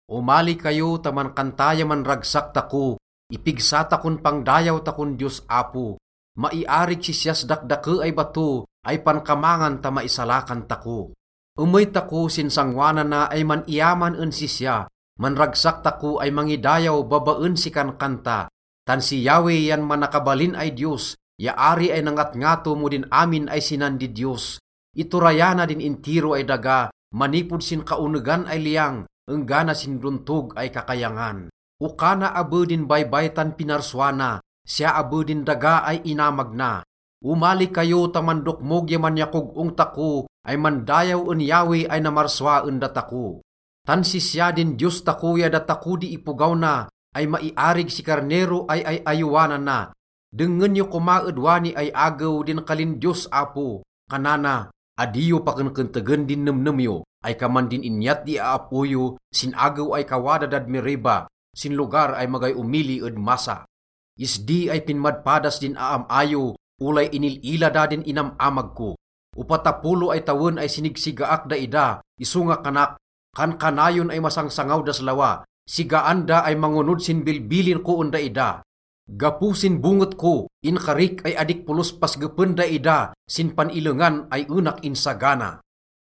Omali kayo ta mankanta ya manragsak tako, ipigsa takon pangdayaw takon Diyos Apo. Maiarig sisyas dakdake ay bato ay pankamangan ta maisalakan tako. Emey tako sin sangoanana ay man-iyaman en sisya, manragsak tako ay mangidayaw babaen si kankanta. Tan si Yahweh yan manakabalin ay Diyos ya ari ay nangatngato mo din amin ay sinan didiyos. Iturayana din intiro ay daga manipod sin kaonegan ay liyang enggana sin dontog ay kakayangan. Oka na abe din baybay tan pinarsua na, siya abe din daga ay inamag na. Omali kayo ta mandokmog ya manyakog-ong tako ay mandayaw en Yahweh ay namarsua en datako. Tan sisya din Diyos tako ya datako di ipogaw na ay maiarig si karnero ay ay-ayowanana. Dengngen yo koma ed wani ay agew din kalin Diyos Apo. Kanana, “Adi yo pakenkentegen din nemnem yo ay kaman din inyat di aap-o yo sin agew ay kawada dad Meriba, sin lugar ay magay omili ed Massa. Isdi ay pinmadpadas din aam-a yo olay inil-ila da din inam-amag ko. Opatapolo ay tawen ay sinigsigaak daida. Isonga kanak, ‘Kankanayon ay masangsangaw das lawa. Sigaan da ay mangonod sin bilbilin ko en daida.’ Gapo sin bonget ko inkarik ay adik polos pasgepen daida sin pan-illengan ay enak insagana.”